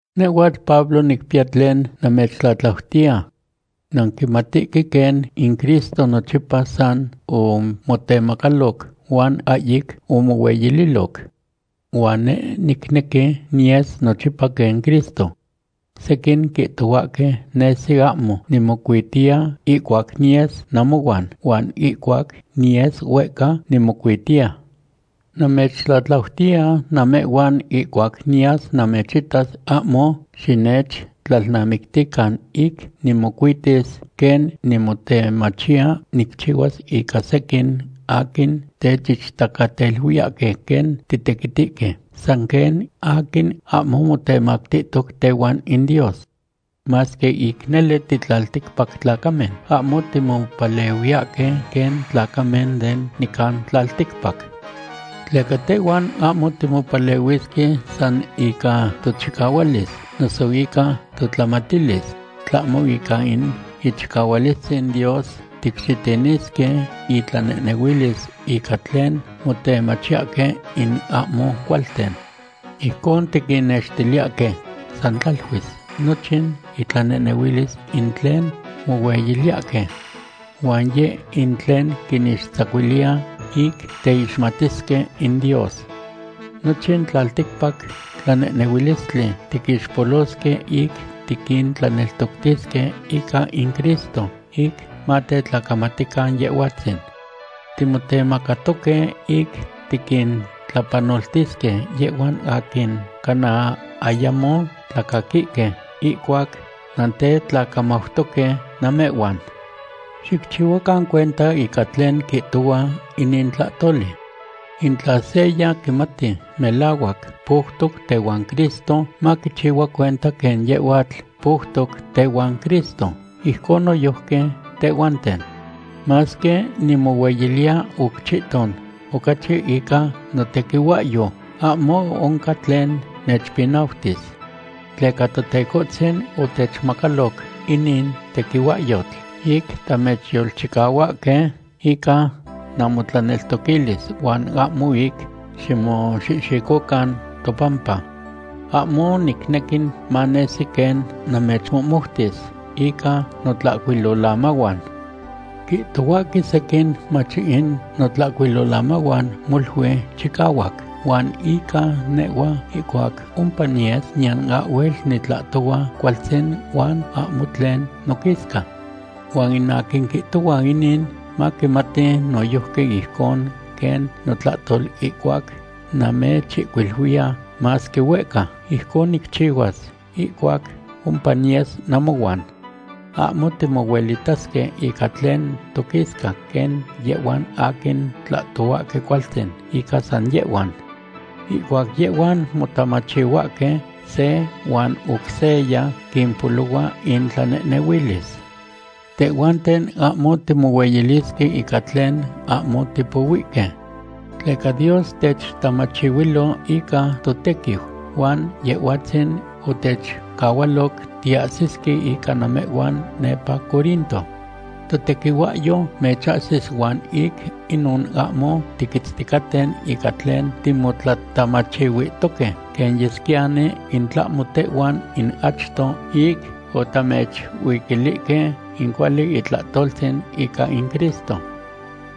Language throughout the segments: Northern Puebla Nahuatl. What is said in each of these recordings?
Nehhuatl Pablo nicpiya tlen namechtlatlautiya. Nanquimatihque quen in Cristo nochipa san omotemacaloc huan ahyic omohueyililoc. Huan neh nicnequi niyes nochipa quen Cristo. Sequin quihtohuahque nesi ahmo nimocuitiya ihcuac niyes namohuan, huan ihcuac niyes huehca, nimocuitiya. Namechtlatlautiya namehhuan ihcuac niyas namechitas ahmo xinechtlalnamictican ic nimocuitis, quen nimotemachiya nicchihuas ica sequin aquin techichtacateluiyahque quen titequitihque san quen aquin ahmo motemactihtoc tehuan in Dios. Masque ic nele titlalticpactlacamen, ahmo timopalehuiyahque quen tlacamen de nican tlalticpac. Tleca tehhuan ahmo timopalehuisque san ica tochicahualis, noso ica totlamatilis, tlahmo ica in ichicahualistzin Dios ticxitinisque intlanehnehuilis ica tlen motemachiyahque in ahmo cualten. Ijcon tiquinnextiliyahque san tlaluis nochin intlanehnehuilis ic tlen mohueyiliyahque. Huan yeh in tlen quinixtzacuiliya ic teixmatisque in Dios. Nochin tlalticpac tlanehnehuilistli tiquixpolosque ic tiquintlaneltoctisque ica in Cristo, ic matetlacamatican Yehhuatzin. Timotemacatoque ic tiquintlapanoltisque yehhuan aquin cana ayamo tlacaquihque ihcuac nantetlacamautoque namehhuan. Xicchihuacan cuenta ica tlen quihtohua inin tlatoli. In tla seya quimati melahuac poutoc tehuan Cristo, maquichihua cuenta quen yehhuatl poutoc tehuan Cristo, ijcon noyojqui tehhuanten. Masque nimohueyiliya oc chihton ocachi ica notequihuahyo, ahmo oncan tlen nechpinautis. Tleca Totecohtzin otechmacaloc inin tequihuahyotl ic tamechyolchicahuahque ica namotlaneltoquilis huan ahmo ic ximoxihxicocan topampa. Ahmo nicnequi manesi quen namechmohmoutis ica notlahcuilolamahuan. Quihtohuahque sequin mach in notlahcuilolamahuan molui chicahuac, huan ica nehhua ihcuac ompa niyes, niyan ahhuel nitlahtohua cualtzin huan ahmo tlen noquisca. Huan in aquin quihtohua inin maquimati noyojqui ijcon quen notlahtol ihcuac namechihcuiluiya masque huehca, ijcon nicchihuas ihcuac ompa niyes namohuan. Ahmo timohuelitasque ica tlen toquisca quen yehhuan aquin tlahtohuahque cualtzin ica san yehhuan. Ihcuac yehhuan motamachihuahque se huan oc seya, quimpolohua intlanehnehuilis. Tehhuanten ahmo timohueyilisque ica tlen ahmo tipohuihque. Tleca Dios techtlatamachihuilo ica totequiu huan Yehhuatzin otechcahualoc tiahsisque ica namehhuan nepa Corinto. Totequihuahyo mechahsis huan ic inon ahmo tiquitzticaten ica tlen timotlatamachihuihtoque quen yesquiyani in tlahmo tehhuan in achto ic otamechuiquilihque in cuali itlahtoltzin ica in Cristo.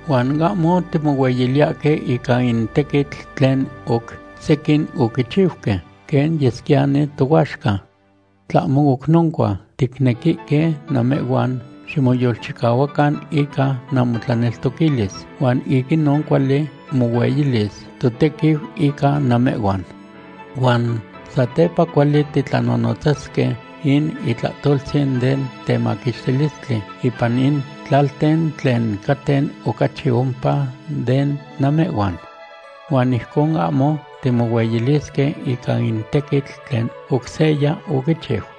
Huan ahmo timohueyiliyahque ica in tequitl tlen oc sequin oquichiuque, quen yesquiyani tohuaxca. Tlahmo oc noncua, ticnequihque namehhuan ximoyolchicahuacan ica namotlaneltoquilis, huan ic inon cuali mohueyilis totequiu ica namehhuan. Huan satepa cuali titlanonotzasque in itlahtoltzin den temaquixtilistli ipan in tlalten tlen caten ocachi ompa de namehhuan. Huan ijcon ahmo timohueyilisque ica in tequitl tlen oc seya oquichiu.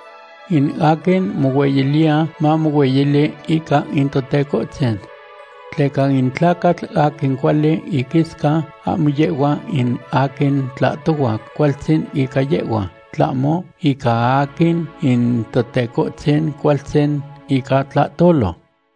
In aquin mohueyiliya, mamohueyili ica in Totecohtzin. Tleca in tlacatl aquin cuali iquisca, ahmo yehhua in aquin tlahtohua cualtzin ica yehhua, tlahmo ica aquin in Totecohtzin cualtzin ica tlahtolo.